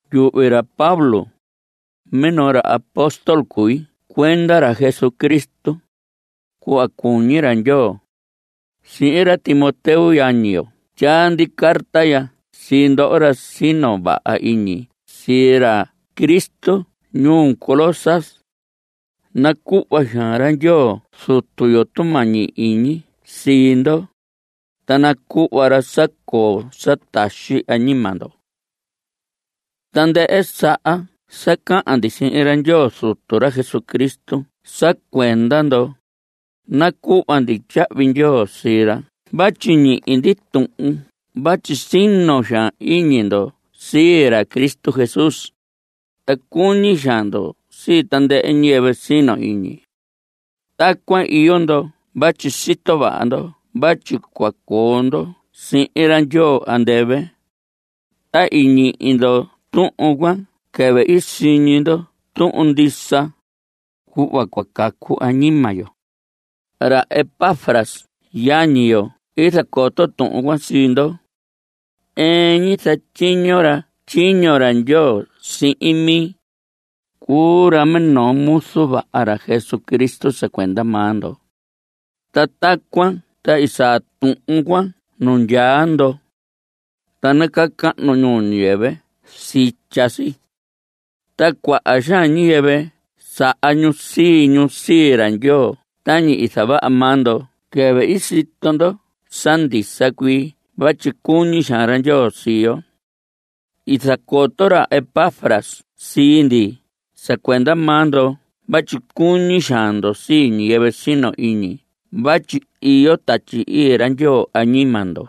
Yuhvi ra Pablo, minoo ra apóstol cui cuenda ra Jesucristo, cuhva cuñi ra Ndyoo. Sihin ra Timoteo yañi yo tyaa ndi carta ya sii ndoho ra sino vaha iñi sii ra Cristo ñuu Colosas. Nacuhva xaan ra Ndyoo Zutu yo tumañi iñi sii ndo, ta nacuhva ra sa coo sa taxi añima ndo. Tandɨhɨ saha sa cahan ndi sihin ra Ndyoo Zutu ra Jesucristo sa cuenda ndo, nacuhva ndi tyahvi ndyoo sii ra vatyi ñihi ndi tuhun vatyi sino xaan iñi ndo sii ra Cristo Jesús, ta cuñi xaan ndo sii tandɨhɨ ñiyɨvɨ sino iñi. Tacuan iyo ndo vatyi sito vaha ndo vatyi cua coo ndo sihin ra Ndyoo andɨvɨ. Ta i ñihi ndo tuhun cuan quɨvɨ i siñi ndo tuhun ndisa, cuhva cua cacu añima yo. Ra Epafras yañi yo i zacoto tuhun cuan sii ndo. Ɨɨn ñi zatyiño ra tyiño ra Ndyoo sihin mi. Cuu ra minoo muzu vaha ra Jesucristo sa cuenda maa ndo. Ta tacuan ta i saa tuhun cuan nu ndyaa ndo. Ta nacahnu ñuu ñiyɨvɨ sitya si. Ta cuaha ñiyɨvɨ saha ñu sii ñu sii ra Ndyoo tañi i zavaha maa ndo quɨvɨ i sito ndo sa ndisa cuii vatyi cuñi xaan ra Ndyoo sii yo. I zacoto ra Epafras sii ndi sa cuenda maa ndo vatyi cuñi xaan ndo sii ñiyɨvɨ sino iñi vatyi iyo Tatyi Ii ra Ndyoo añima ndo.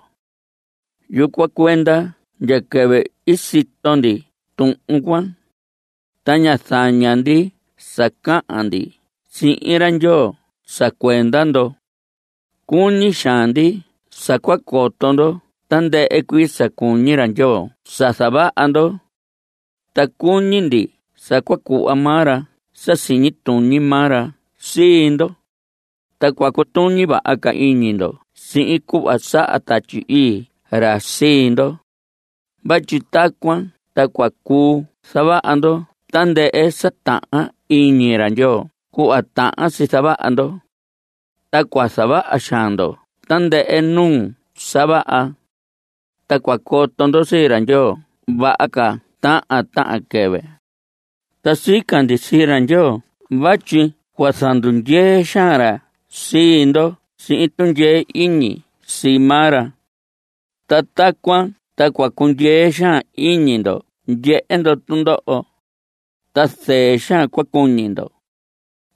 Yucuan cuenda ndya quɨvɨ i sito ndi tuhun cuan, ta ñá zaña ndi sa cahan ndi sihin ra Ndyoo sa cuenda ndo. Cuñi xaan ndi sa cua coto ndo tandɨhɨ cuii sa cuñi ra Ndyoo sa zavaha ndo. Ta cuñi ndi sa cua cuhva maa ra sa siñi tuñi maa ra sii ndo, ta cua cutuñi vaha iñi ndo sihin cuhva saha Tatyi Ii ra sii ndo. Vatyi tacuan ta cua cuu zavaha ndo tandɨhɨ sa tahan iñi ra Ndyoo cuhva tahan si zavaha ndo. Ta cua zavaha xaan ndo tandɨhɨ nuu sa vaha. Ta cua coto ndo sii ra Ndyoo vaha ca tahan tahan quɨvɨ. Ta sica ndi sii ra Ndyoo vatyi cua zandundyee xaan ra sii ndo sihin tundyee iñi sii maa ra. Ta tacuan ta cua cundyee xaan iñi ndo ndyehe ndo tundoho, ta zɨɨ xaan cua cuñi ndo.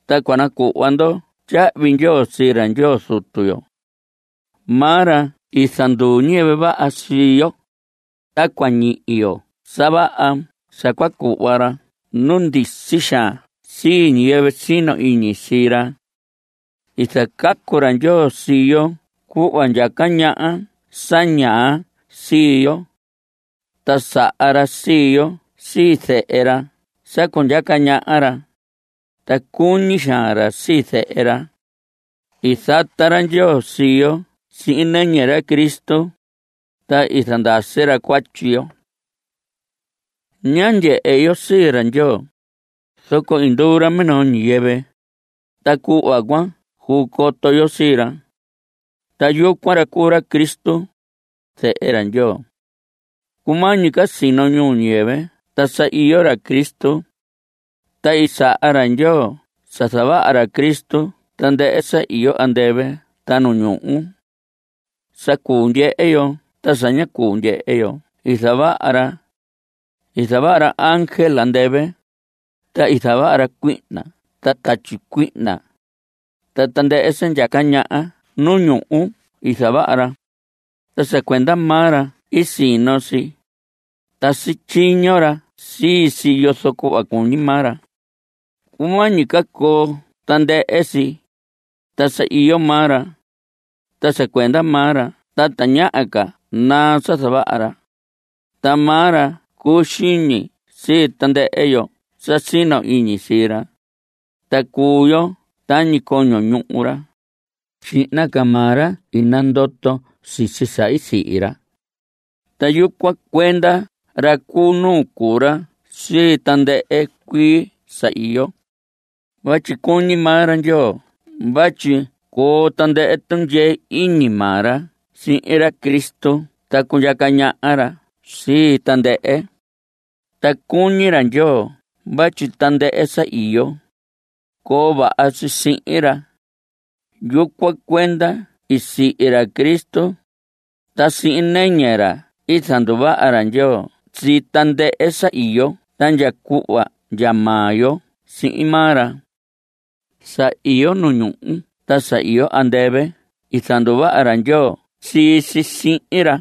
Ta cua nacuhva ndo tyahvi ndyoo sii ra Ndyoo Zutu yo. Maa ra i zanduu ñiyɨvɨ vaha sii yo, ta cua ñihi yo sa vaha sa cua cuhva ra nu ndisi xaan sii ñiyɨvɨ sino iñi sii ra. I zacacu ra Ndyoo sii yo cuhva ndyaca ñaha sa ñaa sii yo. Ta saha ra sii yo sii zehe ra sa cundyaca ñaha ra, ta cuñi xaan ra sii Zehe ra. I zata ra Ndyoo sii yo sihin nɨñɨ ra Cristo, ta i zandasi ra cuatyi yo. Ña ndyehe yo sii ra Ndyoo. Zoco i nduu ra minoo ñiyɨvɨ, ta cuhva cuan cuu coto yo sii ra. Ta yucuan ra cuu ra Cristo, Zehe ra Ndyoo. Cumañi ca sino ñuu ñiyɨvɨ ta sa iyo ra Cristo. Ta i saha ra Ndyoo sa zavaha ra Cristo tandɨhɨ sa iyo andɨvɨ ta nu ñuhu. Sa cuu ndyehe yo ta sa ña cuu ndyehe yo i zavaha ra. I zavaha ra ángel andɨvɨ. Ta i zavaha ra cuihna ta tatyi cuihna. Ta tandɨhɨ sa ndyaca ñaha nu ñuhu i zavaha ra, ta sa cuenda maa ra i sino si. Ta sityiño ra sii si yozo cuhva cuñi maa ra. Cumañi ca coo tandɨhɨ si, ta sa iyo maa ra. Ta sa cuenda maa ra ta tañaha ca naa sa zavaha ra. Ta maa ra cuu xiñi sii tandɨhɨ yo sa sino iñi sii ra, ta cuu yo tañi coño ñuhu ra. Xihna ca maa ra i nandoto sisi sa i sihi ra. Ta yucuan cuenda ra cu nuu cuu ra sii tandɨhɨ cuii sa iyo. Vatyi cuñi maa ra Ndyoo vatyi coo tandɨhɨ tundyee iñi maa ra sihin ra Cristo ta cundyaca ñaha ra sii tandɨhɨ. Ta i cuñi ra Ndyoo vatyi tandɨhɨ sa iyo, coo vaha si sihin ra. Yucuan cuenda i sihi ra Cristo, ta sihin nɨñɨ ra i zanduvaha ra Ndyoo sii tandɨhɨ sa iyo ta ndya cuhva ndya maa yo sihin maa ra. Sa iyo nu ñuhu ta sa iyo andɨvɨ i zanduvaha ra Ndyoo sii si sihin ra.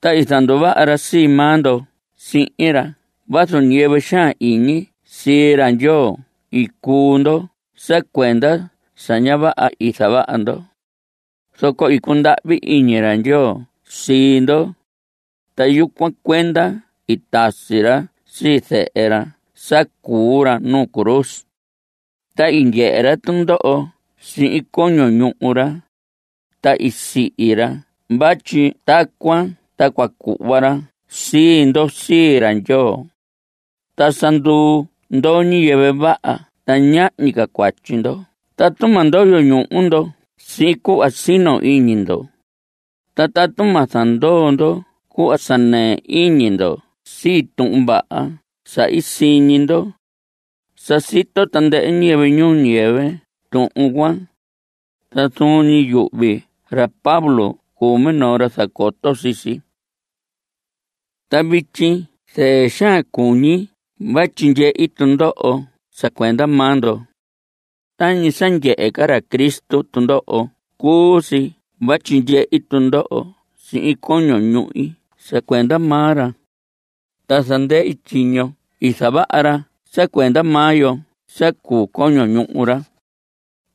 Ta i zanduvaha ra sii maa ndo sihin ra vazu ñiyɨvɨ xaan iñi sii ra Ndyoo i cuu ndo sa cuenda sa ña vaha i zavaha ndo. Zoco i cundahvi iñi ra Ndyoo sii ndo, ta yucuan cuenda i tasi ra sii Zehe ra sa cuu ra nuu cruz. Ta i ndyehe ra tundoho sihin coño ñuhu ra, ta i sihi ra vatyi tacuan ta cua cuhva ra sii ndo sii ra Ndyoo. Ta sa nduu ndo ñiyɨvɨ vaha ta ñahñi ca cuatyi ndo tatu ma ndoyo ñuhu ndo sihin cuhva sino iñi ndo, ta tatu ma zandoo ndo cuhva sa nɨɨ iñi ndo sii Tuhun Vaha sa i siñi ndo. Sa sito tandɨhɨ ñiyɨvɨ ñuu ñiyɨvɨ tuhun cuan. Ta zuun ñi yuhvi ra Pablo cuu minoo ra zacoto sii si. Ta vityi zɨɨ xaan cuñi vatyi ndyehi tundoho sa cuenda maa ndo. Tañi sa ndyehe ca ra Cristo tundoho cuu si vatyi ndyehi tundoho sihin coño ñuhi sa cuenda maa ra. Ta zandɨhi tyiño i zavaha ra sa cuenda maa yo sa cuu coño ñuhu ra.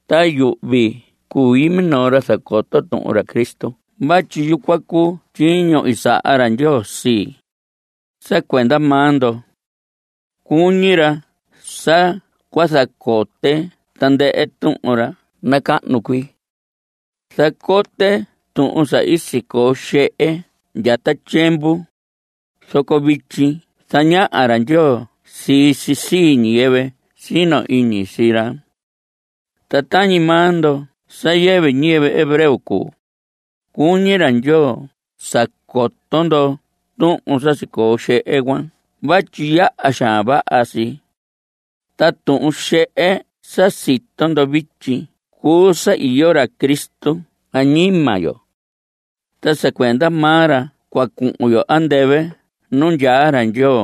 Ta yuhvi cui minoo ra zacoto tuhun ra Cristo vatyi yucuan cuu tyiño i saha ra Ndyoo sii, sa cuenda maa ndo. Cuñi ra sa cua zacote tandɨhɨ tuhun ra nacahnu cuii. Zacote tuhun sa sicoo xehe ndya ta tyiemvu, zoco vityi zañaha ra Ndyoo sii si sii ñiyɨvɨ sino iñi sii ra. Ta tañi maa ndo sa yɨvɨ ñiyɨvɨ hebreo cuu, cuñi ra Ndyoo sa coto ndo tuhun sa sicoo xehe cuan vatyi yaha xaan vaha si. Ta tuhun xehe sa sito ndo vityi cuu sa iyo ra Cristo añima yo. Ta sa cuenda maa ra cua cuhun yo andɨvɨ nu ndyaa ra Ndyoo.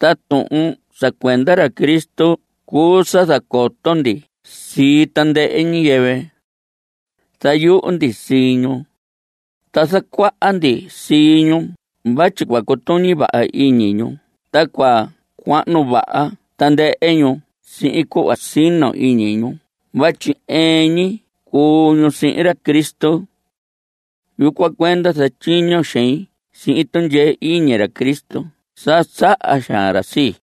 Ta tuhun sa cuenda ra Cristo cuu sa zacoto ndi sii tandɨhɨ ñiyɨvɨ. Zayuhu ndi sii ñu, ta zacuaha ndi sii ñu vatyi cua cutuñi vaha iñi ñu ta cua cuahnu vaha tandɨhɨ ñu sihin cuhva sino iñi ñu vatyi ɨɨn ñi cuu ñu sihin ra Cristo. Yucuan cuenda zatyiño xein sihin tundyee iñi ra Cristo sa saha xaan ra sii.